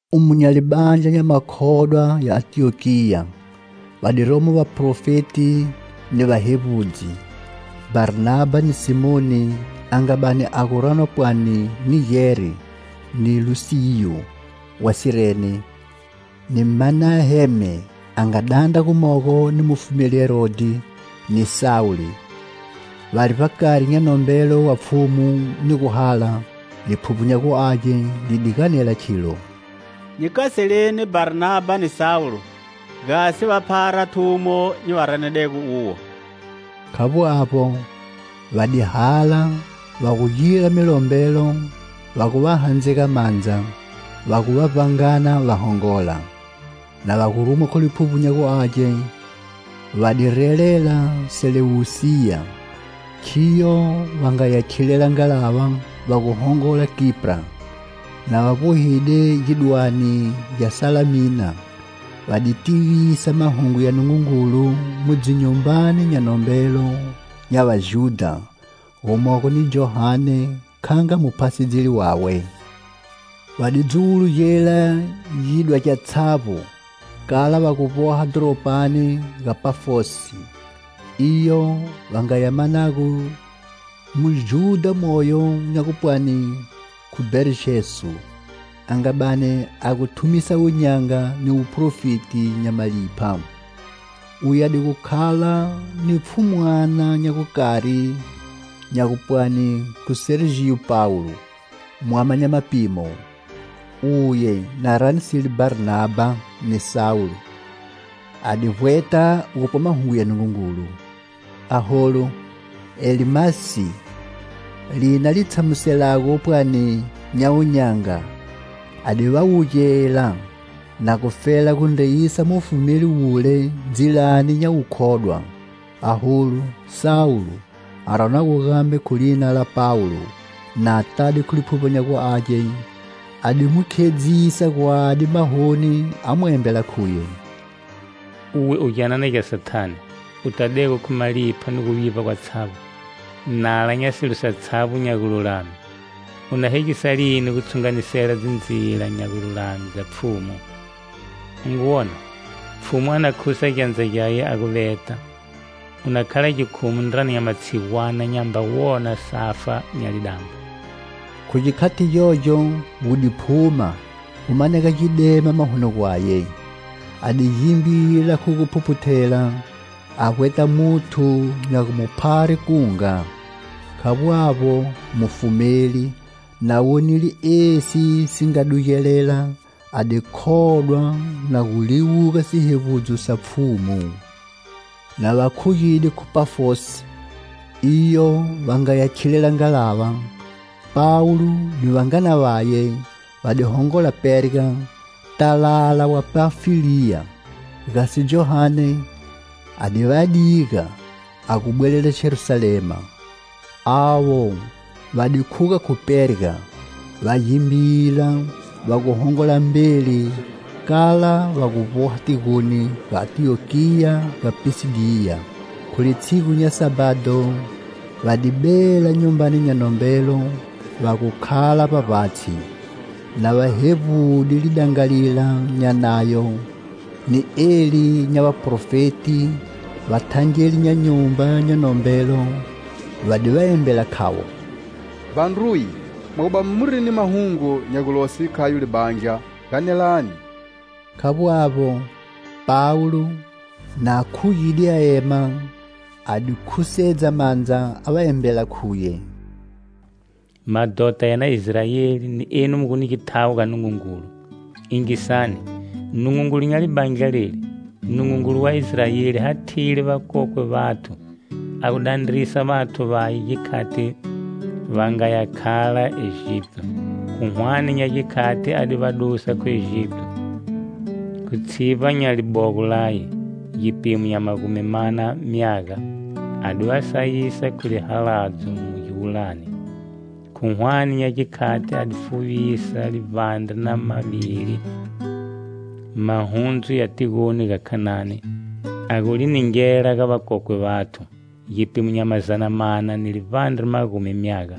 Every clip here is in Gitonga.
Umo nya libandla nya makhodwa ya Antiyokiya, va di romo vaprofeti ni vahevbudzi: Bharnabha ni Simoni a nga bani a gu ranwa pwani Nigeri, ni Lusiyu wa Sirene, ni Manaheme a nga dandra gumogo ni mufumeli Herodhi, ni Sawulo. Vari vbakari nya nombelo wa Pfhumu ni guhala, Liphuvbo nya gu Age li di ganela khilo: "Nyi kaseleni Bharnabha ni Sawulo gasi va phara thumo nyi va ranedego uwo." Khavbo avbo, va di hala, va gu gira milombelo, va gu va handzega mandza, va gu va vbangana va hongola. Na va gu rumwa khu Liphuvbo nya gu Age, va di relela Selewusiya, Khiyo va nga ya khilela ngalava va gu hongola Kipra. Na va vbohile gidwane gya Salamina, va di tivisa Mahungu ya Nungungulu mu dzinyumbani nya nombelo nya Vajudha, gumogo ni Johane kha nga muphasedzeli wawe. Va di dzuwulugela gidwa gyatshavbo kala va gu vboha dhoropani ga Pafosi, iyo va nga ya manago Mujudha moyo nya gupwani khu Barjesu a nga bani a gu thumisa wun'yanga ni wuprofeti nya malipha. Uye a di gu khala ni pfhumwana nya gukari nya gupwani khu Serjiyo Pawulo, mwama nya mapimo. Uye, na ranisile Bharnabha ni Sawulo, a di vbweta gupwa mahungu ya Nungungulu. Aholu, Elimasi, lina li tshamuselago pwani nya wun'yanga a di va wugela, na gufela gu ndreyisa mufumeli wule ndzilani nya wukhodwa. Aholu, Sawulo, a ranwago gambe khu lina la Pawulo, na tade khu Liphuvbo nya gu Age, a di mu khedzisa gwadi mahoni a mu embela khuye: "Uwe u gyanana gya Sathane, u tadego khu malipha ni guvivba gwatshavbo, nala nya silo satshavbo nya gululame, u na hegisa lini gu tshunganisela dzindzila nya gululame dza Pfhumu? U ngu wona, Pfhumu a na khusa gyandza gyaye a gu veta. U na khala gikhumu ndrani nya matshigwana, nyamba wona safa nya lidambo." Khu gikhati gyogyo gu di phuma, gu manega gidema mahoni gwaye. A di gimbila khu gu phuphuthela a vbweta muthu nya gu mu phare kunga. Khavbo avbo, mufumeli, na wonile esi si nga dugelela a di khodwa na gu liwuga sihevbudzo sa Pfhumu. Na va khugide khu Pafosi, iyo va nga ya khilela ngalava, Pawulo ni vangana vaye va di hongola Perga, talala wa Panfiliya gasi Johane a di va diga a gu bwelela Jerusalema. Avo va di khuga khu Perga, va gimbila, va gu hongola mbeli kala va gu vboha tigoni ga Antiyokiya ga Pisidiya. Khu litshigu nya Sabhado, va di bela nyumbani nya nombelo va gu khala vbavbatshi. Na va hevbude lidangalila nya Nayo ni eli nya vaProfeti, vathangeli nya nyumba nya nombelo va di va embela khavo: "Vandruye, mwa gu bani muri ni mahungu nya gulose khayo libandla, ganelani." Khavbo avbo, Pawulo, na khugide a ema, a di khusedza mandza a va embela khuye: "Madhota ya na Israeli ni enu mu gu ni githawo ga Nungungulu, yingisani: Nungungulu nya libandla leli, Nungungulu wa Israeli hathile vakokwe vathu, a gu dandrisa vathu vaye gikhati va nga ya khala Egipito. Khu hwane nya gikhati a di va dusa khu Egipito, khu tshivba nya libogo Laye. Gipimo nya magumi mana myaga a di va sayisa khu lihaladzo mu giwulani. Khu hwane nya gikhati a di fuvisa livbandre na mavili mahundzu ya tigoni ga Khanani, a gu li ningela ga vakokwe vathu, gipimo nya mazana mana ni livbandre magumi myaga.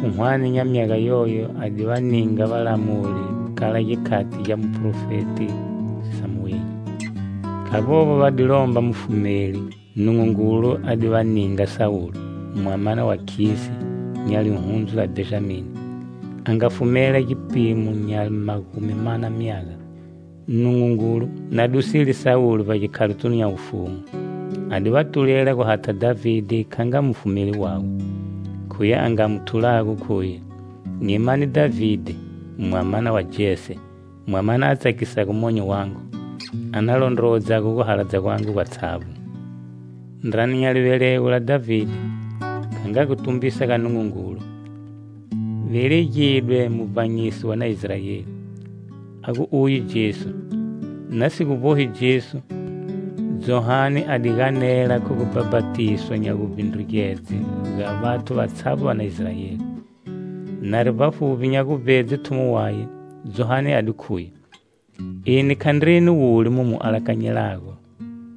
Khu hwane nya myaga yoyo a di va ninga valamuli kala gikhati gya muprofeti Samueli. Khavbo avbo, va di lomba mufumeli, Nungungulu a di va ninga Sawulo, mwamana wa Khisi, nya lihundzu la Bhenjami, a nga va fumela gipimo nya magumi mana myaga. Nungungulu, na dusile Sawulo vbagikhalotunu nya wufumu, a di va tulela gu hatha Dhavide kha nga mufumeli wawe. Khuye a nga mu thulago khuye: 'Nyi mane Dhavide, mwamana wa Jese, mwamana a tsakisago monyo wangu, a na londrowodzago guhaladza gwangu gwatshavbo.' Ndrani nya livelego la Dhavide, kha nga gutumbisa ga Nungungulu, velegidwe Muvbanyisi wa na Israeli, a gu uye Jesu. Na si gu vbohi Jesu, Johane a di ganela khu gu bhapatiswa nya guvbindrugedze ga vathu vatshavbo va na Israeli. Nari vbafuvbi nya guvbedze thumo waye, Johane a di khuye: 'Eni khandreni wule mu mu alakanyelago,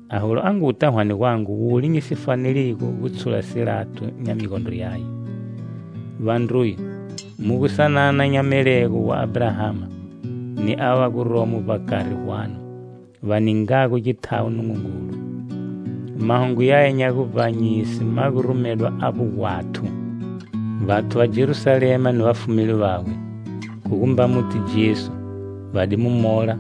aholu a nguta hwane gwangu wule nyi si faneligo gu tshula silato nya migondro yaye.' "Vandruye, mu gu sanana nya melego wa Abrahama, ni ava va guromo vbakari gwanu, va ningago githawo Nungungulu, mahungu yaya nya guvbanyise ma gu rumedwa avbo gwathu. Vathu va Jerusalema ni vafumeli vawe, khu gumba muti Jesu, va di mu mola,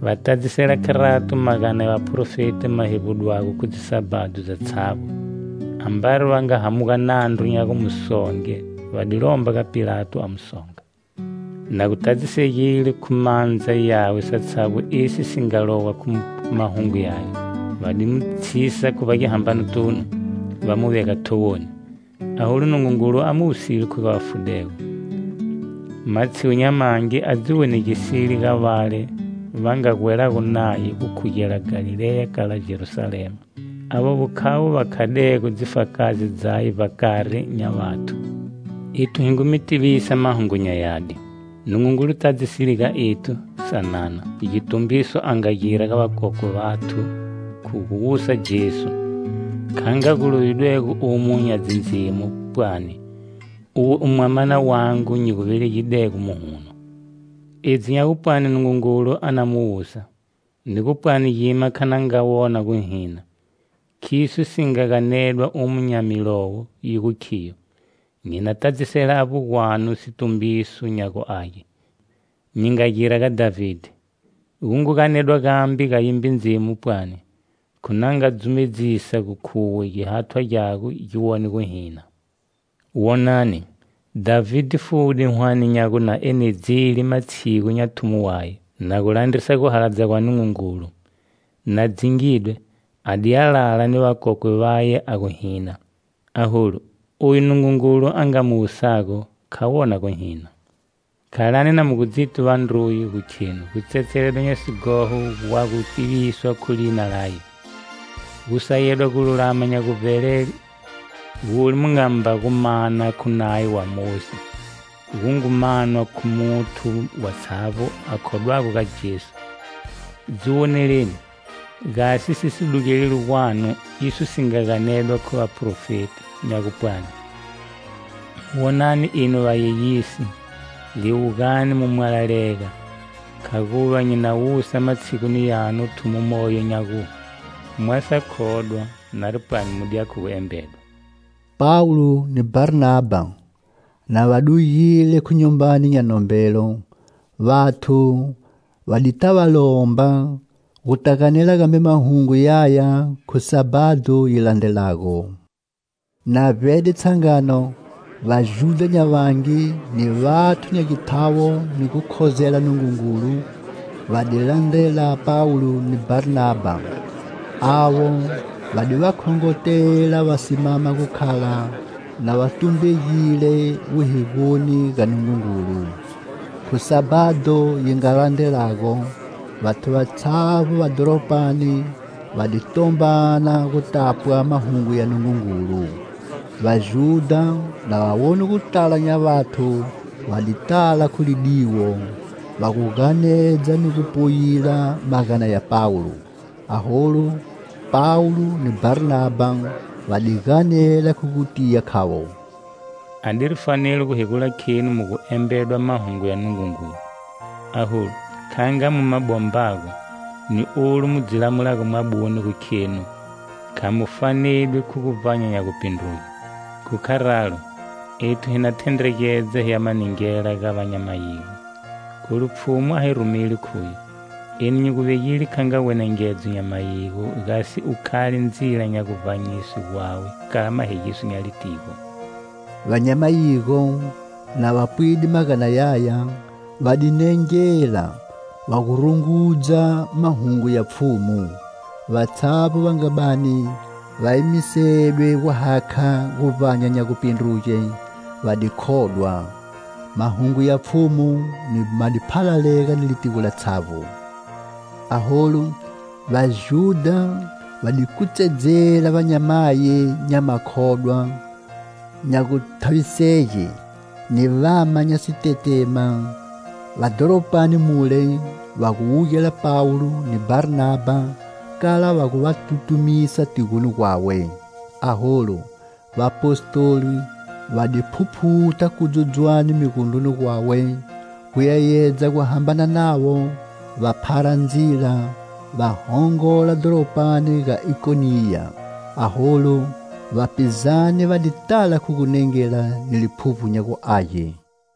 va tadzisela kharato magana ya vaprofeti ma hevbudwago khu dzisabhado dzatshavbo. Ambari va nga hamuga nandru nya gu mu songe va di lomba ga Pilato a mu songa. Na gu tadzisegile khu mandza yawe satshavbo esi si nga lowa khu mahungu yaye, va di mu tshisa khu vbagihambanotunu, va mu vega thowoni. Aholu, Nungungulu a mu wusile khu ga vafudego. Matshigu nya mangi a dzi wonegisile ga vale va nga gwelago Naye gukhugela Galileya kala Jerusalema; Avovo khavo va khadego dzifakazi dzaye vbakari nya vathu. Ethu hi ngu mi tivisa mahungu nya yadi. Nungungulu tadzisile ga ethu, sanana, gitumbiso a nga gira ga vakokwe vathu, khu gu wusa Jesu. Kha nga gu lovidwego umo nya Dzindzimo, pwani: 'Uwe u Mwamana wangu nyi gu velegidego muhuno.' Edzi nya gupwani Nungungulu a na mu wusa, ni gu pwani gima kha na nga wona guhina, khiso si nga ganedwa umo nya milowo, yi gu khiyo: 'Nyi na tadzisela avbo gwanu situmbiso nya guage nyi nga gira ga Dhavide.' Gu ngu ganedwa gambe ga yimbe Ndzimu pwani: 'Khu na nga dzumedzisa gu khuwe gihathwa gyago gi wone guhina.' Wonani, Dhavide fude hwane nya gu na enedzile matshigu nya thumo waye, na gu landrisa guhaladza gwa Nungungulu. Na dzingidwe, a di ya lala ni vakokwe vaye a gu hina. Aholu, oyu Nungungulu a nga mu wusago, kha wona guhina. Khalani na mu gu dziti, vandruye, gu khenu gutsetseledwa nya sighoho gwa gu tiviswa khu lina laye. Gusayedwa gululama nya guvbelele, gule mu ngamba gu mana khu Nayo wa Mosi, gu ngu manwa khu muthu watshavbo a khodwago ga Jesu. Dzi woneleni, gasi si si dugeleli gwanu iso si nga ganedwa khu vaProfeti, nya gupwani: 'Wonani, enu vayeyisi;liwugani mu mwalalega!Khaguva nyi na wusa matshiguni yanu thumo moyo nya gu, mwa sa khodwa, nari pwani mu diya khu gu embedwa.' " Pawulo ni Bharnabha, na va dugile khu nyumbani nya nombelo, vathu va di ta va lomba, gu ta ganela gambe mahungu yaya khu Sabhado yi landrelago. Na vbede tshangano, Vajudha nya vangi, ni vathu nya githawo ni gu khozela Nungungulu va di landrela Pawulo ni Bharnabha. Avo va di va khongotela va simama gu khala na va tumbegile wuhigoni ga Nungungulu. Khu Sabhado yi nga landrelago, vathu vatshavbo va dhoropani va di tombana gu tapwa mahungu ya Nungungulu. Vajudha na va wone gutala nya vathu va di tala khu lidiwo, va gu ganedza ni gu poyila magana ya Pawulo. Aholu, Pawulo ni Bharnabha va di ganela khu gutiya khavo: "A diri fanelo gu hegula khenu mu gu embedwa mahungu ya Nungungulu. Aholu, kha nga mu ma bombago, ni olu mu dzi lamulago mwabune gu khenu kha mu fanedwi khu guvbanya nya gupindruge, khu kharalo, ethu hi na thendregedza hi ya ma ningela ga va nya mayigo. Kholu Pfhumu a hi rumile khuye: 'Eni nyi gu vegide kha nga wenengedzo nya mayigo gasi u khale ndzila nya guvbanyiswe gwawe kala mahegiso nya litigo.' " Va nya mayigo, na va pwide magana yaya, va di nengela, va gu rungudza mahungu ya Pfhumu; vatshavbo va nga bani va emisedwe guhakha guvbanya nya gupindruge, va di khodwa. Mahungu ya Pfhumu ma di phalalega ni litigo latshavbo. Aholu Vajudha va di kutsedzela vanyamayi nya makhodwa nya guthavisege, ni vama nya sitetema va dhoropani mule va wugela Pawulo ni Bharnabha kala va gu va tutumisa tigoni gwawe. Aholu, vapostoli va di phuphutha kudzudzwane migondroni gwawe, gu yeyedza guhambana navo, va phara ndzila va hongola dhoropani ga Ikoniya. Aholu, vapizane va di tala khu gunengela ni Liphuvbo nya gu Age.